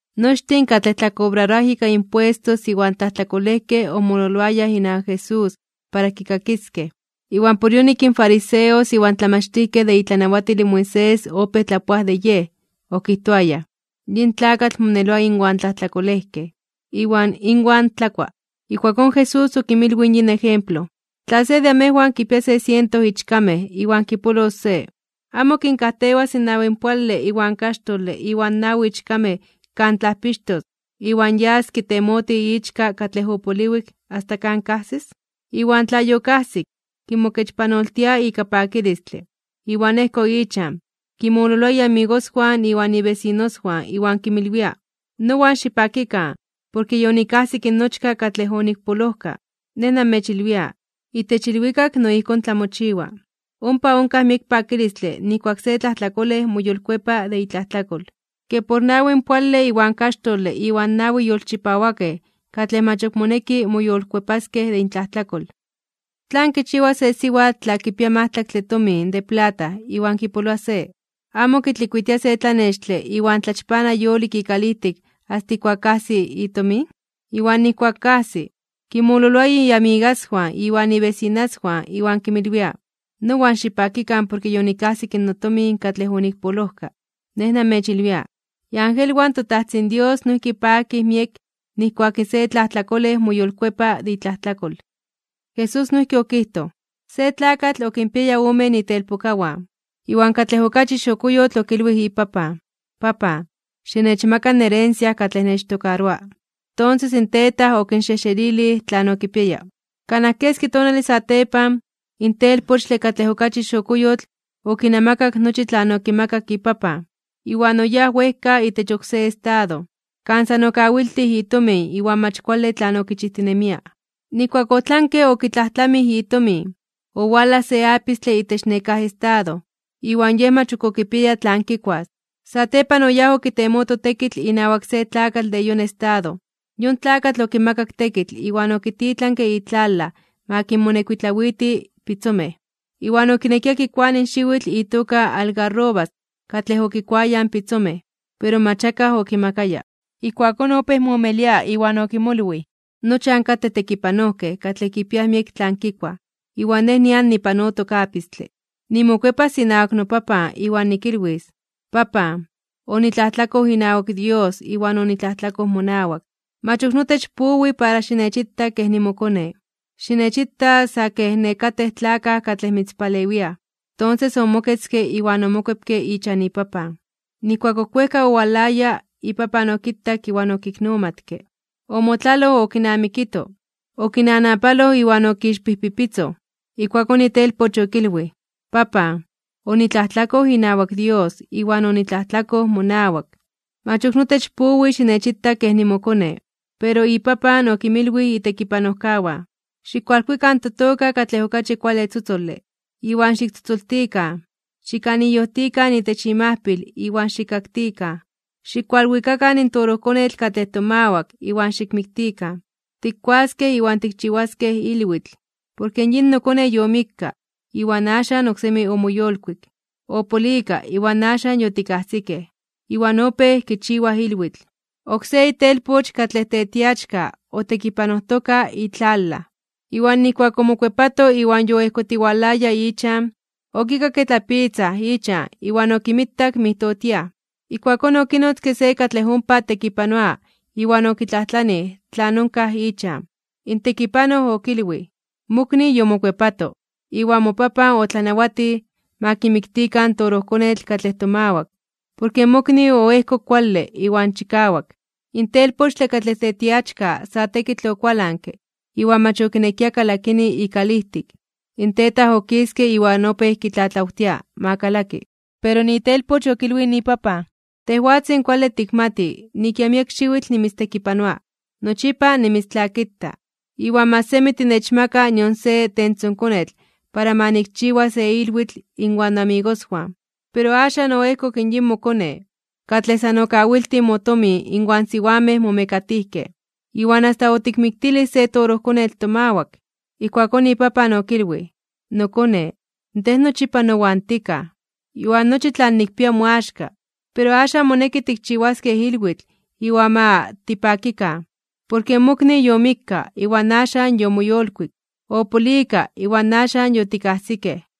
Nochtin katlej tlakobraroaj ika impuestos iwan tlajtlakolejkej omololoayaj inawak Jesús para kikakiskej, iwan por yonik in fariseos iwan tlamachtijkej de itlanawatil in Moisés opéj tlapoaj de Yej, okijtoayaj: ―Yin tlakatl moneloa inwan tlajtlakolejkej, iwan inwan tlakua. Ijkuakón Jesús okinmilwij in yin ejemplo: ―Tla se de amejwan kipia se siento ichkamej iwan kipolos se, ¿amo kinkajtewas in nawinpoale iwan kaxtole iwan nawi ichkamej kan tlajpixtos, iwan yas kitemotij ichka katlej opoliwik, asta kan kajsis? Iwan tla yokajsik, kimokechpanoltia ika pakilistle, iwan ejko ichan, kinmololoa iamigoswan iwan ibesinoswan iwan kinmilwia: “Nowan xipakikan, porke yonikajsik nochka katlej onikpolojka.” Nej namechilwia, itech ilwikak no ijkón tlamochiwa. Ompa onkaj miek pakilistle nijkuak se tlajtlakolej moyolkuepa de itlajtlakol, ke por nawinpoale iwan kaxtole iwan nawi yolchipawakej katlej mach ok moneki moyolkuepaskej de intlajtlakol. ’¿Tlan kichiwa se siwatl tla kipia majtlaktle tomin de plata iwan kipoloa se? ¿Amo kitlikuitia se tlanextle iwan tlachpana yolik ikalijtik asta ijkuak kajsi itomin? Iwan nijkuak kajsi, kinmololoa amigaswan iwan ibesinaswan iwan kinmilwia: “Nowan xipakikan, porke yonikajsik notomin katlej onikpolojka.” Nej namechilwia, iangelwan in toTajtzin Dios noijki pakij miek nijkuak se tlajtlakolej moyolkuepa de itlajtlakol. Jesús noijki okijtoj: ―Se tlakatl okinpiaya omen itelpokawan, iwan katlej okachi xokoyotl okilwij ipapan: “Papan, xinechmaka in herencia katlej nechtokaroa.” Tonses in tetaj okinxejxelilij tlan okipiaya. Kanaj keski tonale satepan, in telpochtle katlej okachi xokoyotl okinamakak nochi tlan okimakak ipapan, iwan oyáj wejka itech oksé estado, kan san okawiltij itomin iwan mach kuale tlan okichijtinemia. Nijkuak otlanke okitlajtlamij itomin, owalaj se apistle itech nekáj estado, iwan yej mach ok okipiaya tlan kikuas. Satepan oyáj okitemoto tekitl inawak se tlakatl de yon estado, yon tlakatl okimakak tekitl iwan okititlanke itlalaj ma kinmonekuitlawiti pitzomej. Iwan okinekia kikuani xiwitl itoka algarrobas katlej okikuayaj in pitzomej, pero mach akaj okimakaya. Ijkuakón opéj moomelia (moyejyekoa) iwan okimolwij: “Nochan katej tekipanojkej katlej kipiaj miek tlan kikuaj, iwan nej nian nipanotok apistle. Nimokuepas inawak nopapan, iwan nikilwis: Papan, onitlajtlakoj inawak Dios iwan onitlajtlakoj monawak. Mach ok notech powi para xinechita kej nimokone, xinechita sa kej nekatej tlakaj katlej mitzpalewiaj.” Tonses omoketzke iwan omokuepke ichan ipapan. ’Nijkuak ok wejka owalaya, ipapan okitak iwan okiknomatke. Omotlaloj okinamikito, okinanapaloj (okinawajtekke) iwan okixpijpipitzoj. Ijkuakón itelpoch okilwij: “Papan, onitlajtlakoj inawak Dios iwan onitlajtlakoj monawak. Mach ok notech powi xinechita kej nimokone.” Pero ipapan okinmilwij itekipanojkawan: “Xikkualkuikan totoka katlej okachi kuale tzotzole, iwan xiktzotzoltikan. Xikaniyojtikan itech imajpil iwan xikkaktikan. Xikualwikakan in torojkonetl katlej tomawak iwan xikmiktikan. Tikkuaskej iwan tikchiwaskej ilwitl. Porke yin nokone yomikka, iwan axan oksemi omoyolkuik. Opolika, iwan axan yotikajsikej.” Iwan opéj kichiwaj ilwitl. ’Oksé itelpoch katlej tetiachka otekipanojtoka itlalaj. Iwan nijkuak omokuepato iwan yoejkotiwalaya ichan, okikakke tlapitzaj ichan iwan okinmitak mijtotiaj. Ijkuakón okinotzke se katlej ompa tekipanoa iwan okitlajtlanij tlan onkaj ichan. In tekipanoj okilwij: “Mokni yomokuepato. Iwan mopapan otlanawatij ma kimiktikan in torojkonetl katlej tomawak, porke mokni oejkok kuale iwan chikawak.” In telpochtle katlej tetiachka sa tekitl okualanke iwan mach okinekia kalakini ikalijtik. In tetaj okiske iwan opéj kitlatlawtia ma kalaki. Pero itelpoch okilwij ipapan: “Tejwatzin kuale tikmati nik ya miek xiwitl nimitztekipanoa, nochipa nimitztlakita, iwan mach semi tinechmaka nion se tentzonkonetl para nikchiwas se ilwitl inwan noamigoswan. Pero axan oejkok yin mokone, katlej san okawiltij motomin inwan siwamej momekatijkej, iwan asta otikmiktilij se torojkonetl tomawak.” Ijkuakón ipapan okilwij: “Nokone, tej nochipa nowan tikaj, iwan nochi tlan nikpia moaxka. Pero axan moneki tikchiwaskej ilwitl iwan ma tipakikan, porke mokni yomikka, iwan axan yomoyolkuik. Opolika, iwan axan yotikajsikej.”